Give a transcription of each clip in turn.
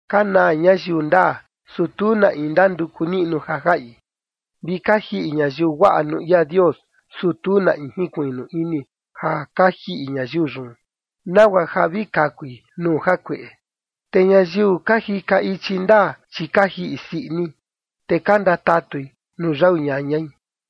Ka naa ñayiu ndaa, su tu na in ndanduku niꞌnu ja jaꞌi, vi ka jiꞌi ñayiu guaꞌa nuu ia Dios, su tu na in jinkuiꞌnu ini ja ka jiꞌi ñayiu yun, nagua ja vi kakui nuu jakueꞌe. Te ñayiu ka jika ichi ndaa, chi ka jiꞌi sii ini, te ka ndatatui nuu yau ñañai.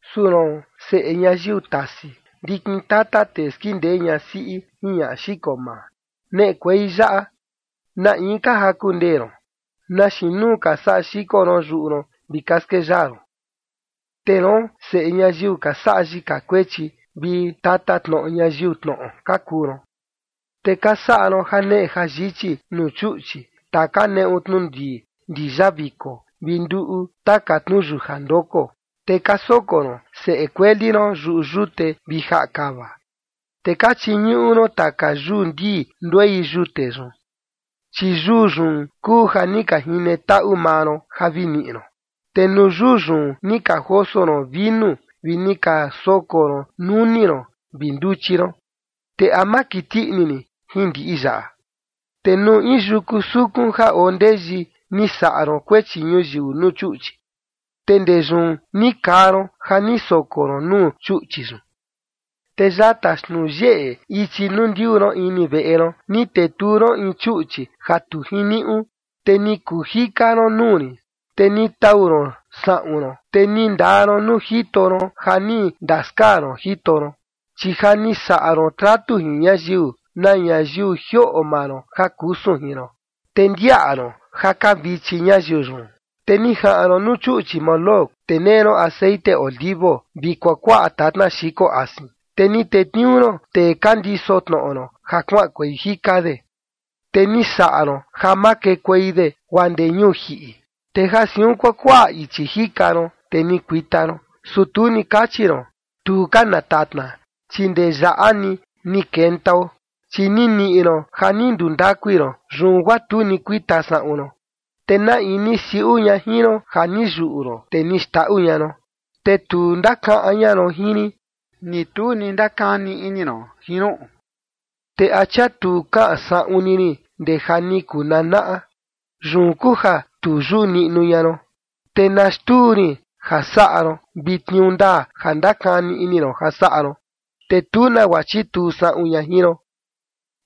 “Su roon, seꞌe ñayiu tasi, ndikin tata tee skindee ñasiꞌi jin ñaꞌa xiko maa, neꞌekuei yaꞌa. ¿Na in ka jaku ndee ron? ¿Na xiin nuu ka saꞌa xiko ron yuꞌu ron vi ka skeyaa ron? Te roon, chi seꞌe ñayiu ka saꞌa yika kuechi vi tatatnoꞌo ñayiu tnoꞌo ka kuu ron. Te ka saꞌa ron janeꞌe jayichi nuu chuꞌchi taka neꞌu tnu ndii ndiyaviko vi nduꞌu taka yutnu ndoko, te ka soko ron seꞌe kueli ron yuꞌu yute vi jaꞌa kava. Te ka chiñuꞌu ron taka yuu ndii nduei yute yun, chi yuu yun kuu ja ni ka jine taꞌu maa ron ja vi niꞌi ron. Te nuu yuu yun ni ka joso ron vinu vi ni ka soko ron nuni ron vi nduchi ron, ¿te a ma kiti ini rin jin ndiꞌi yaꞌa? Te nuu in yuku sukun ja oo ndeyi ni saꞌa ron kuechi ñuyiu nuu chuꞌchi, te ndee yun ni kaa ron ja ni soko ron nuu chuꞌchi yun. Te yata xtnuu yeꞌe ichi nuu ndiuu ron ini veꞌe ron, ni tetuu ron in chuꞌchi ja tu jiniuꞌu, te ni kuu jika ron nuu rin. Te ni tau ron saꞌun ron, te ni ndaa ron nuu jito ron ja ni ndaskaa ron jito ron, chi ja ni saꞌa ron tratu jin ñayiu, na ñayiu jioꞌo maa ron ja kusun jin ron, te ndiaꞌa ron ja ka vichi ñayiu yun. Te ni jaꞌan ron nuu chuꞌchi Moloc, te nee ron texeꞌen olivo vi kuakuaꞌa tatna xiko asin, te ni tetniuu ron tee ka ndiso tnoꞌo ron ja kuaꞌankuei jika de, te ni saꞌa ron ja makekuei de guaa ndee ñuu jiꞌi. Te ja siun kuakuaꞌa ichi jika ron, te ni kuita ron, su tu ni kachi ron: Tu ka na tatna, chi ndee yaꞌa ni ni kentao. Chi ni niꞌi ron ja ni ndundakui ron, yun guaa tu ni kuita saꞌun ron. ¿Te na in ni siuꞌu ña jin ron ja ni yuꞌu ron, te ni xndaꞌu ña ron? Te tu ndakaꞌan ña ron jin rin, ni tu ni ndakani ini ron jin ruꞌun. ¿Te a chia tu kaꞌan saꞌun ni rin ndee ja ni kuu nanaꞌa? Yun kuu ja tu yuꞌu niꞌnu ña ron. Te na xtuu rin ja saꞌa ron vi tniuu ndaa ja ndakani ini ron ja saꞌa ron, te tu nagua chituu saꞌun ña jin ron.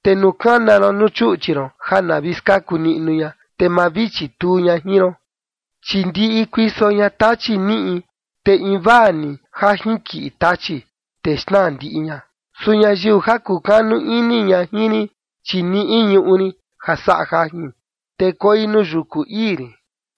Te nuu kana ron nuu chuꞌchi ron ja na vi skaku niꞌnu ña, te ma vi chituu ña jin ron, chi ndiꞌi kuiso ña tachi niꞌi, te vi invaa ni ja jinkiꞌi tachi, te xnaa ndiꞌi ña. Su ñayiu ja kukanu ini ña jin rin, chi niꞌi ñuꞌu rin ja saꞌa jajin, te koi nuu yuku ii rin.”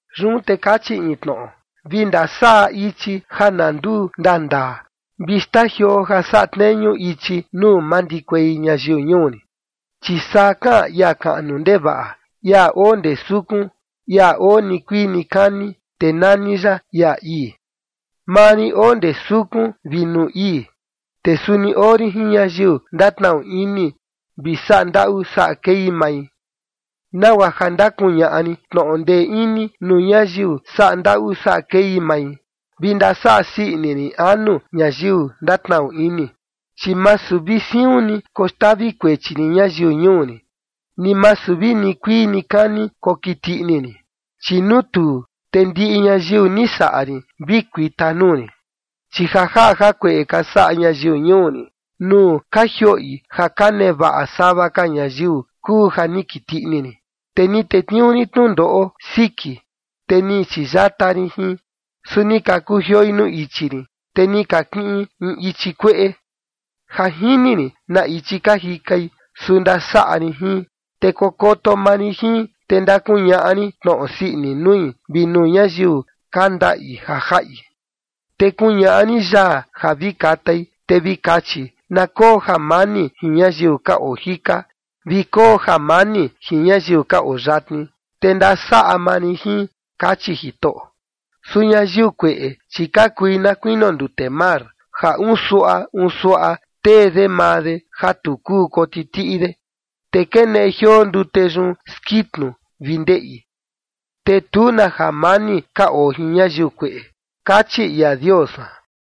Yun te kachi in tnoꞌo: “Vi ndasaꞌa ichi ja na nduu ndandaa, vi xtajioo ja saꞌa tneñu ichi nuu mandikuei ñayiu ñuu rin”. Chi saa kaꞌan ia kaꞌnu ndevaꞌa, ia oo ndee sukun, ia oo nikuii nikani, te nani ya ia ii: “Maa rin oo ndee sukun vi nuu ii, te suni oo rin jin ñayiu ndatnaꞌu ini vi saꞌa ndaꞌu saꞌa kei mai, nagua ja ndakuñaꞌa rin tnoꞌo ndee ini nuu ñayiu saꞌa ndaꞌu saꞌa kei mai, vi ndasaꞌa sii ini rin anu ñayiu ndatnaꞌu ini. Chi masu vi siun ni koxtavi kuechi rin ñayiu ñuu rin, ni masu vi nikuii nikani kokiti ini rin, chi nuu tuu, te ndiꞌi ñayiu ni saꞌa rin vi kuita nuu rin. Chi ja jaꞌa jakueꞌe ka saꞌa ñayiu ñuu rin nuu ka jioꞌi ja ka nevaꞌa sava ka ñayiu, kuu ja ni kiti ini rin, te ni tetniuu rin tnundoꞌo siki, te ni chiyata rin jin, su ni ka kujioi nuu ichi rin, te ni ka kiꞌin in ichi kueꞌe. Ja jini rin na ichi ka jikai, su ndasaꞌa rin jin, te kokoto maa rin jin, te ndakuñaꞌa rin tnoꞌo sii ini nui, vi nuu ñayiu ka ndaꞌi ja jaꞌi. Te kuñaꞌa rin yaa ja vi katai, te vi kachi: Na koo jamani jin ñayiu ka oo jika vi koo jamani jin ñayiu ka oo yatni, te ndasaꞌa maa rin jin”, kachi Jitoꞌo. Su ñayiu kueꞌe, chi ka kui na kuinio ndute mar, ja unsuaꞌa unsuaꞌa tee de maa de ja tu kuu kotitiꞌi de, te keneꞌe jioo ndute yun skitnu vi ndeꞌi. “Te tu na jamani ka oo jin ñayiu kueꞌe”, kachi ia Dios san.